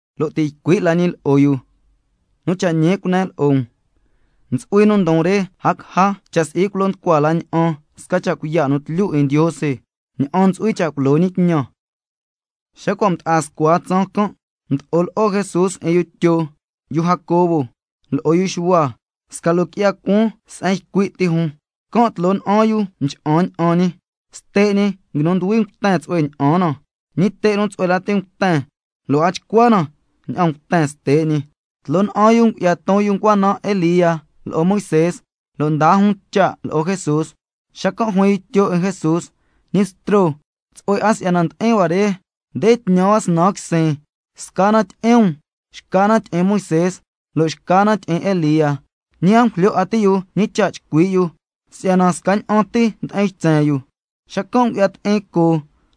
Lo' ti' ycui' la ñi lo'o yu: Nu cha' ñi cunen lo'o um, ntsu'hui nu ndon re a caja cha' si'i culo nducua la ña'an sca cha' cuiya' nu tlyu 'in Ndiose ña'an ntsu'hui cha' culo ñi tñan. Xa cua' mda'a scua tsaan can', mdo'o lo'o Jesús 'in yu Tyo, yu Jacobo, lo'o yu Xuhua, sca loo qui'ya cuaan se'en ycui' ti jun, can' tloo na'an yu mcha'an ña'an ñi. Ste' ñi nguinu nduhui mten tsu'hue ña'an na, ñi te' nu tsu'hue lati nguiten, lo' a nchcua na ña'an mten ste' ñi. Tloo na'an yu ngu'ya ton yu ncua naan Elía lo'o Moisé, lo' ndaa jun cha' lo'o Jesús. Xacan' juin yu Tyo 'in Jesús: Ñi Bstro, tsu'hue 'a si'yana ndi'in hua re, nde tñan hua snan quisin, sca na tyi'in um, xca na tyi'in Moisé, lo' xca na tyi'in Elía. Ñi a ngujlyo 'a ti' yu, ñi cha' chcui' yu si'yana scaña'an ti ndi'in ytsen yu. Xacan' ngu'ya ti'in coo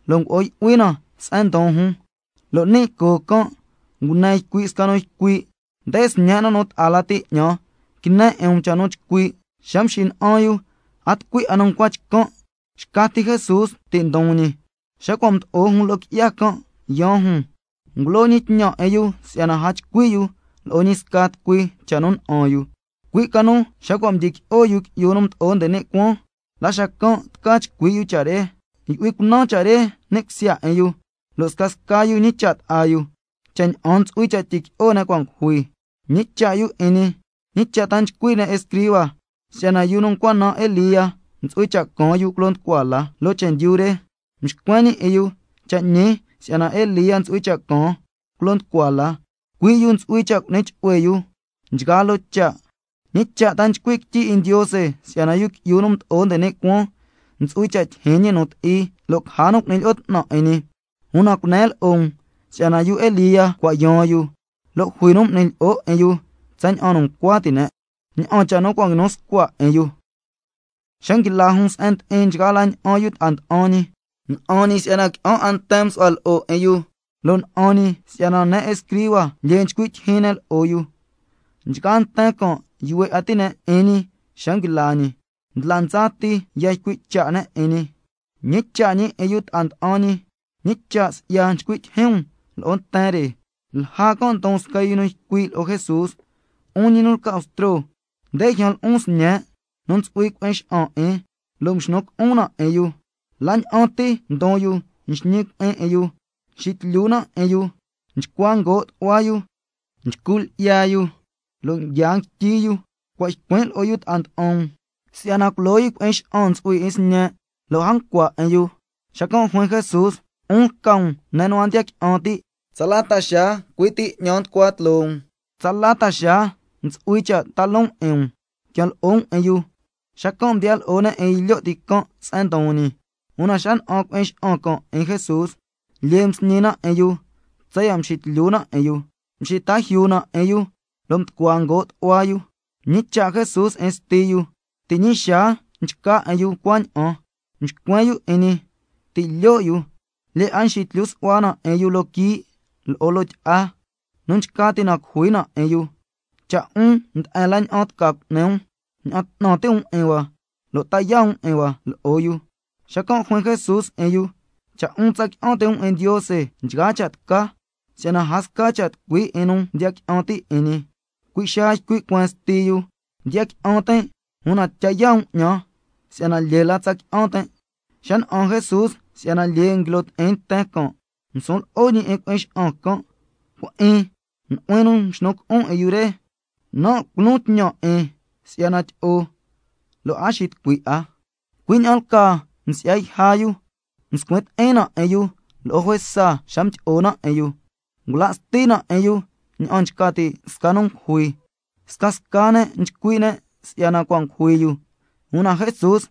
lo' ngo'o yu'hui na se'en ndon jun, lo' ni' coo can' ngune ycui' sca nu ycui': Nde Sñen' nu ta'a lati 'ñan, quine 'in um cha' nu chcui'. Xa mxina'an yu a tucui 'a nu ncua chcan', xca ti Jesús ti' ndon ñi. Xa cua' mdo'o jun loo qui'ya can' yaan jun, ngulo ñi tñan 'in yu si'yana a chcui' yu lo'o ñi sca tucui cha' nu na'an yu, cui' ca nu xa cua' mdyiqui'o Yu Qui'yu nu Mdo'o nde ni' Cuaan la xacan' tca chcui' yu cha' re. Yu'hui cunan cha' re ni' cusya 'in yu, lo' scasca yu ñicha' ta'a yu, cha' ña'an ntsu'hui cha' tyiqui'o ne' cua' ngujui. Mñicha' yu 'in ñi: ¿Ñi cha' ta nchcui' ne' escriba, si'yana yu nu ncua naan Elía ntsu'hui cha' caan yu culo nducua la loo chendyu re? Mxcuen ñi 'in yu: Cha' ñi si'yana Elía ntsu'hui cha' caan culo nducua la, cui' yu ntsu'hui cha' cu'ni chu'hue yu nchgaa loo cha'. ¿Ñi cha' ta nchcui' quityi 'in Ndiose si'yana Yu Qui'yu nu Mdo'o nde ni' Cuaan ntsu'hui cha' tyijyin ñi nu ti'i, lo' caja nu cu'ni lyi'o 'tnan 'in ñi? Una cunen lo'o um si'yana yu Elía cua' yaan yu, lo' jui nu m'ni lyi'o 'in yu tsaña'an nu ncua ti' ne', cui' cha' nu cua' nguinu scua cha' 'in yu. Xa nguila jun se'en ndi'in nchgaa la ña'an yu ta'a nda'an ñi, na'an ñi si'yana qui'an 'a nten msu'hua lo'o 'in yu, lo' na'an ñi si'yana ne' escriba lyee nchcui' tyijyin ne' lo'o yu. Nchgaa nten can' yuhue 'a ti' ne' 'in ñi xa nguila ñi, ndla ndsa ti ya ycui' cha' ne' 'in ñi. Mñicha' ñi 'in yu ta'a nda'an ñi: ¿Ñi cha' si'ya nchcui' tyijyin um lo'o nten re? Lja can' ndon sca nu ycui' lo'o Jesús: 'Un ñi nu lca Bstro, nde ljyan lo'on sñen' nu ntsu'hui cui'in xa'an 'in, lo' mxnu cu'un na 'in yu. La ña'an ti ndon yu nxñi cui'in 'in yu, nxitlyu na 'in yu, nchcua ngoo' tu'hua yu, nchcu lyi'ya yu, lo' nguia nguityi yu. Cua' ycuin' lo'o yu ta'a nda'an um, si'yana culo yu cui'in xa'an ntsu'hui 'in sñen', lo' a ncua 'in yu. Xacan' juin Jesús: 'Un lca um ne' nu a ndiya qui'an ti', ¿tsala ta xaa cui' ti 'ñan nducua tloo um? ¿Tsala ta xaa ntsu'hui cha' ta loon 'in um? Quian lo'o um 'in yu. Xacan' mdiya lo'o ne' 'in yu lyo' ti can' se'en ndon ñi, una xa na'an cui'in xa'an can' 'in Jesús, lyee lati msñi na 'in yu tsaya' mxitlyu na 'in yu, mxita yuu na 'in yu, lo' mducua ngoo' tu'hua yu. Mñicha' Jesús 'in sti yu: ¿Ti' ñi xaa nchca 'in yu cuaña'an? Mxcuen yu 'in ñi: Ti' lyo' yu. Lyee 'a nxitlyu su'hua na 'in yu loo quii' lo'o loo tyi'a, nu nchca ti' na cujui na 'in yu. Cha' 'un nde'en la ña'an tca cu'ni um, ña'an 'tnan ti' um 'in hua lo' ta yaa' um 'in hua lo'o yu. Xacan' juin Jesús 'in yu: Cha' 'un tsa qui'an ti' um 'in Ndiose nchgaa cha' tca, si'yana a sca cha' tucui 'in nu ndiya qui'an ti' 'in ñi. Cui' xaa ycui' cueen sti yu: Ndiya qui'an tin', una tya yaa' um 'ñan si'yana lyee la tsa qui'an tin'. Xa na'an Jesús si'yana lyee nguilo ti'in nten can', ngusun lo'o ñi 'in cui'in xa'an can': Cui'in, nu'huin nu mxnu cu'un 'in yu re, nan' culon tñan 'in si'yana tyi'o, lo' a xitucui 'a. Cui' ña'an lcaa msi'ya yja yu, mscuin ti'in na 'in yu lo'o juesa xa mdyi'o na 'in yu, ngula' sti na 'in yu ña'an nchca ti' sca nu ngujui. Scasca ne' nchcui' ne' si'yana cua' ngujui yu. Una Jesús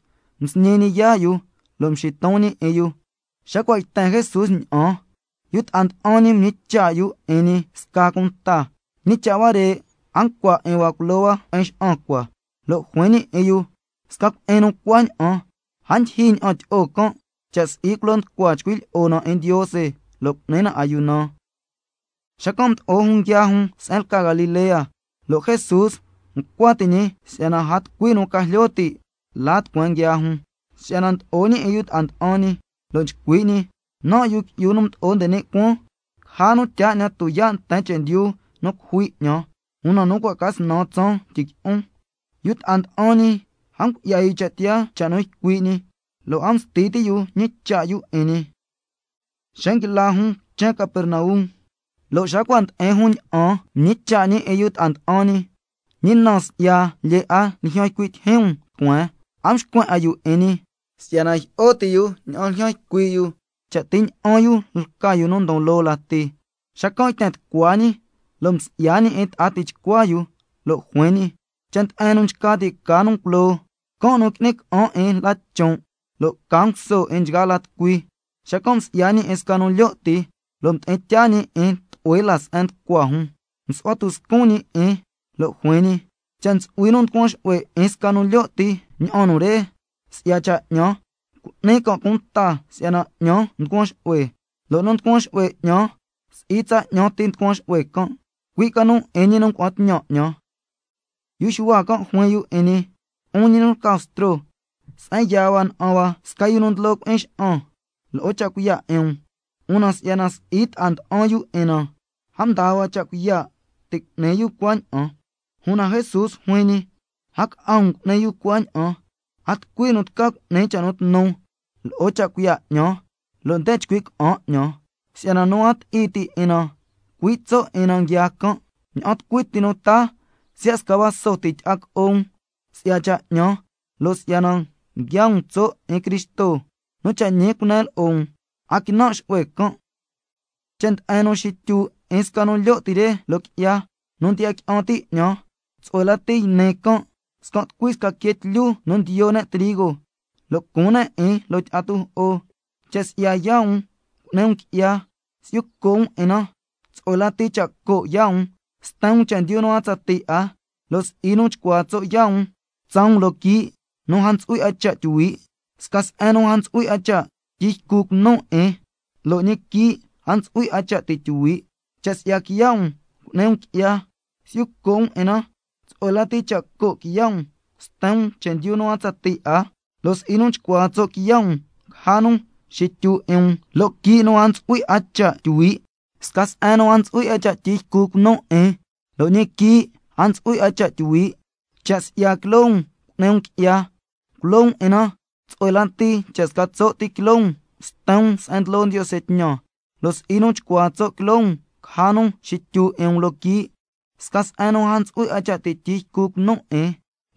msñi ñi yaa' yu lo' mxiton ñi 'in yu. Xa cua' yten Jesús ña'an, yu ta'a nda'an ñi mñicha' yu 'in ñi sca cunta: ¿Ñi cha' huare' a ncua 'in hua culo hua cui'in xa'an cua? Lo' juin ñi 'in yu: Sca cui'in nu cuaña'an a ndyijyi ña'an tyi'o can', cha' si'i culo nducua chcui' lyi'o na 'in Ndiose lo' cu'ni na ayuna. Xacan' mdo'o jun nguiaa jun se'en lca Galilea, lo' Jesús ncua ti' ñi si'yana a tucui nu ca jlyo ti' la tucueen nguiaa jun, si'yana ndlo'o ñi 'in yu ta'a nda'an ñi, lo' nchcui' ñi: Nan', Yu Qui'yu nu Mdo'o nde ni' Cuaan, caja nu tyaa 'ñan tuyaa' nten chendyu nu cujui 'ñan, una nu cua' ca snan tsaan tyiqui'on. Yu ta'a nda'an ñi a ngu'ya yu cha' tiyaa cha' nu ycui' ñi, lo' a msti ti' yu ñicha' yu 'in ñi. Xa nguila jun quichen Capernaum, lo' xa cua' ndi'in jun ña'an, mñicha' ñi 'in yu ta'a nda'an ñi: ¿Ñi na si'ya lyee 'a ljyan ycui' tyijyin um tucueen? A mxcuen 'a yu 'in ñi, si'yana jyi'o ti' yu ña'an ljyan ycui' yu, cha' ti ña'an yu lca yu nu ndon loo lati. Xacan' yten tucua ñi lo' msi'ya ñi 'in ta'a tichcua yu, lo' juin ñi: Cha' nde'en nu nchca ti' ca nu culoo, can' nu qui'ni ca'an 'in la chon', lo' ca nguso 'in nchgaa la tucui. Xacan' msi'ya ñi 'in sca nu lyo' ti, lo' mdi'in tyaa ñi 'in tlu'hue la se'en nducua jun, msu'hua tuscun ñi 'in, lo' juin ñi: Cha' ntsu'hui nu nducuan xu'hue 'in sca nu lyo' ti ña'an nu re, si'ya cha' 'ñan, cu'ni can' cunta si'yana 'ñan nducuan xu'hue, lo' nu nducuan xu'hue 'ñan, si'i tsa 'ñan tin nducuan xu'hue can', cui' ca nu 'in ñi nu ngua'an tñan 'ñan. Yu Xuhua can' juin 'in ñi: 'Un ñi nu lca Bstro, se'en yaa hua na'an hua sca yu nu ndlo cui'in xa'an lo'o cha' cuiya' 'in um, una si'yana si'i ta'a nda'an yu 'in na, a mdaa hua cha' cuiya' ti' cu'ni yu cuaña'an. Una Jesús juin ñi: A ca'a um cu'ni yu cuaña'an, a tucui nu tca cu'ni cha' nu tnu lo'o cha' cuiya' 'ñan, lo' nde chcui' ca'an 'ñan. Si'yana nu a ti'i ti' 'in na, cui' tso' 'in na nguiaa can'. Ña'an tucui ti nu taa siya' sca vaso ti tyi'a co'o um, si'ya cha' 'ñan lo' si'yana nguiaa um tso' 'in Cristo, nu cha' ñi cunen lo'o um, a quinan' xu'hue can'. Cha' nde'en nu xityu 'in sca nu lyo' ti re loo qui'ya, nu ndiya qui'an ti' 'ñan, tsu'hue lati yni can' scan' tucui sca quee tlyu nu ndiyo ne' trigo, lo' cuun ne' 'in loo tyi'a tujo'o. Cha' si'ya yaa' um cu'ni um qui'ya, si'yu co' um 'in na, tsu'hue lati cha' co' yaa' um sten um chendyu nu a tsatii 'a, lo' si'i nu chcuaa tso' yaa' um tsaa um loo quii' nu a ntsu'hui 'a cha' tyuhui', —sca se'en nu a ntsu'hui cha' tyi ycu cunu' 'in, lo' ñi quii' a ntsu'hui 'a cha' ti' tyuhui'—. Cha' si'ya quiya' um cu'ni um qui'ya, si'yu co' um 'in na, tsu'hue lati cha' co' quiya' um sten um chendyu nu a tsatii 'a, lo' si'i nu chcuaa tso' quiya' um caja nu xityu 'in um loo quii' nu a ntsu'hui 'a cha' tyuhui', —sca se'en nu a ntsu'hui cha' tyi ycu cunu' 'in, lo' ñi quii' a ntsu'hui 'a cha' tyuhui'—. Cha' si'ya quiloo um cu'ni um qui'ya, culo um 'in na, tsu'hue lati cha' sca tso' ti quiloo um sten um se'en ndlo Ndiose tñan, lo' si'i nu chcuaa tso' quiloo um caja nu xityu 'in um loo quii', —sca se'en nu a ntsu'hui cha' tyi ycu cunu' 'in,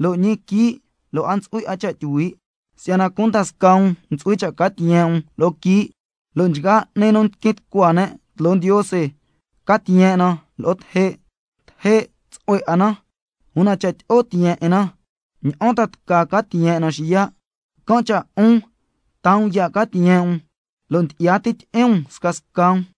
lo' ñi quii' lo' a ntsu'hui 'a cha' tyuhui'—. Si'yana cunda scaa um ntsu'hui cha' ca tiyen' um lo'o quii', lo' nchgaa 'ni nu tiquin tucua ne' tloo Ndiose ca tiyen' na lo'o teje'. Teje' tsu'hue 'a na, una cha' tyi'o tiyen' 'in na, ¿ña'an ta tca ca tiyen' na xiya'? Can' cha' 'un taa um ya' ca tiyen' um, lo' ndyi'ya ti tyi'in um scasca um.